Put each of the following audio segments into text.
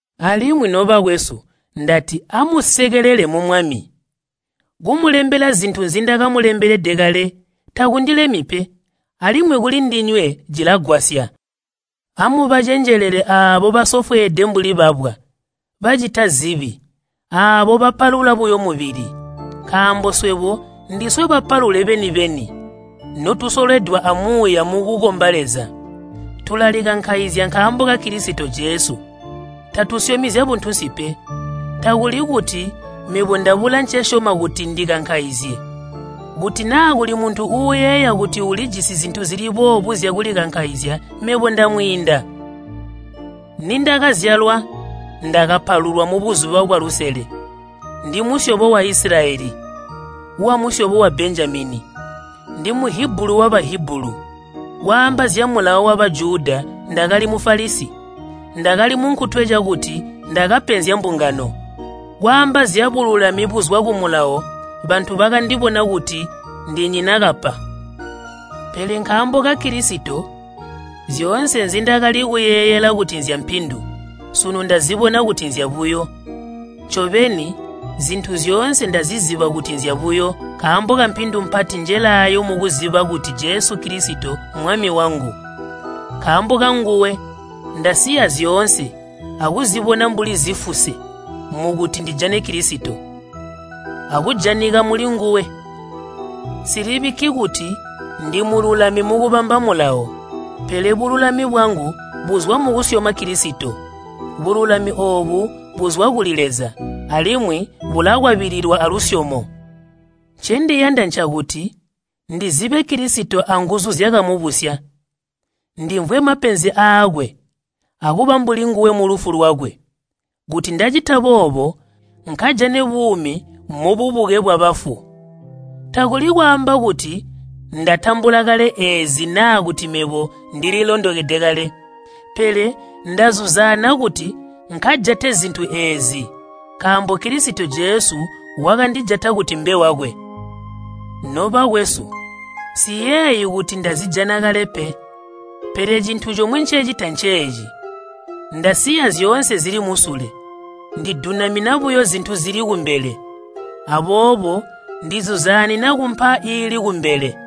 Alimwi, nobakwesu, ndati amusekele mu Mwami. Kumulembela zintu zindakamulembelede kale takundilemyi pe, alimwi kulindinywe cilagwasya. Amubacenjelele aabo basofweede mbuli babwa, bacita zibi, aabo bapalula buyo mubili. Nkaambo swebo ndiswe bapalule beni-beni, notusolwedwa a Muuya mukukomba Leza. Tulalikankaizya nkaambo ka Kilisito Jesu, tatusyomi zyabuntunsi pe. Takuli kuti mebo ndabula ncesyoma kuti ndikankaizye. Kuti naa kuli muntu uuyeeya kuti ulijisi zintu zili boobo zyakulikankaizya mebo ndamwiinda. Nindakazyalwa, ndakapalulwa mubuzuba bwalusele. Ndimusyobo wa Isilayeli, wamusyobo wa Benjamini. Ndi Muhibulu wa Bahibulu. Kwaamba zya Mulawo wa Bajuda, ndakali Mufalisi. Ndakali munkutwe cakuti ndakapenzya mbungano. Kwaamba zyabululami buzwa ku Mulawo bantu bakandibona kuti ndinyina kapa. Pele nkaambo ka Kilisito zyoonse nzindakali kuyeeyela kuti nzyampindu, sunu ndazibona kuti nzyabuyo. Ncobeni, zintu zyoonse ndaziziba kuti nzyabuyo nkaambo kampindu mpati njelaayo mukuziba kuti Jesu Kilisito Mmwami wangu. Nkaambo kanguwe ndasiya zyoonse akuzibona mbuli zifuse mukuti ndijane Kilisito, akujanika mulinguwe. Nsilibikki kuti ndimululami mukubamba Mulawo, pele bululami bwangu buzwa mukusyoma Kilisito, bululami oobu buzwa kuli Leza alimwi bulakwabililwa alusyomo. Ncendiyanda ncakuti ndizibe Kilisito anguzu zyakamubusya. Ndimvwe mapenzi aakwe akuba mbuli nguwe mulufu lwakwe, kuti ndacita boobo nkajane buumi mububuke bwabafu. Takuli kwaamba kuti ndatambula kale eezi naa kuti mebo ndililondokede kale, pele ndazuzaana kuti nkajate zintu eezi nkaambo Kilisito Jesu wakandijata kuti mbe wakwe. Nobakwesu, nsiyeeyi kuti ndazijana kale pe. Pele cintu comwe ncecita nceeci, ndasiya zyoonse zili musule, ndidunamina buyo zintu zili kumbele. Aboobo ndizuzaanina kumpa iili kumbele,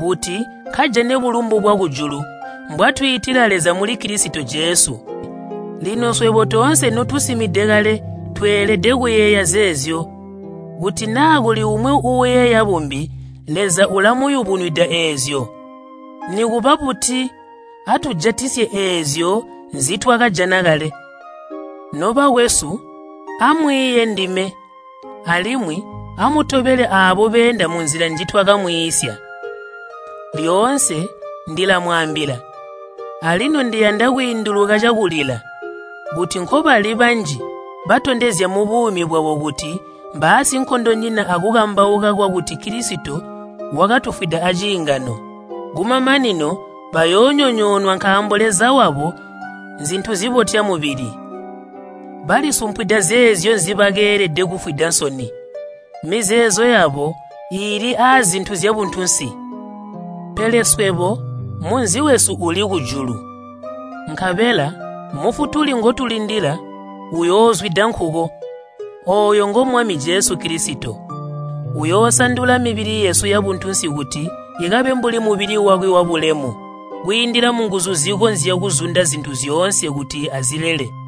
kuti nkajane bulumbu bwakujulu mbwatwiitila Leza muli Kilisito Jesu. Lino swebo toonse notusimide kale tweelede kuyeeya zeezyo. Kuti naa kuli umwi uuyeeya bumbi, Leza ulamuyubunwida eezyo. Nikuba buti, atujatisye eezyo nzitwakajana kale. Nobakwesu, amwiiye ndime, alimwi amutobele aabo beenda munzila njitwakamwiisya. Lyoonse ndilamwaambila, alino ndiyanda kwiinduluka cakulila, kuti nkobali banji batondezya mubuumi bwabo kuti mbaasinkondonyina akukambauka kwakuti Kilisito wakatufwida aciingano. Kumamanino bayoonyonyoonwa nkaambo leza wabo nzintu zibotya mubili. Balisumpwida zeezyo nzibakeelede kufwida nsoni. Mizeezo yabo iili aazintu zyabuntunsi. Pele swebo munzi wesu uli kujulu, nkabela Mufutuli ngotulindila uyoozwida nkuko. Ooyo ngo Mwami Jesu Kilisito, uyoosandula mibili yesu yabuntunsi kuti ikabe mbuli mubili wakwe wabulemu, kwiindila munguzu zikonzya kuzunda zintu zyoonse kuti azilele.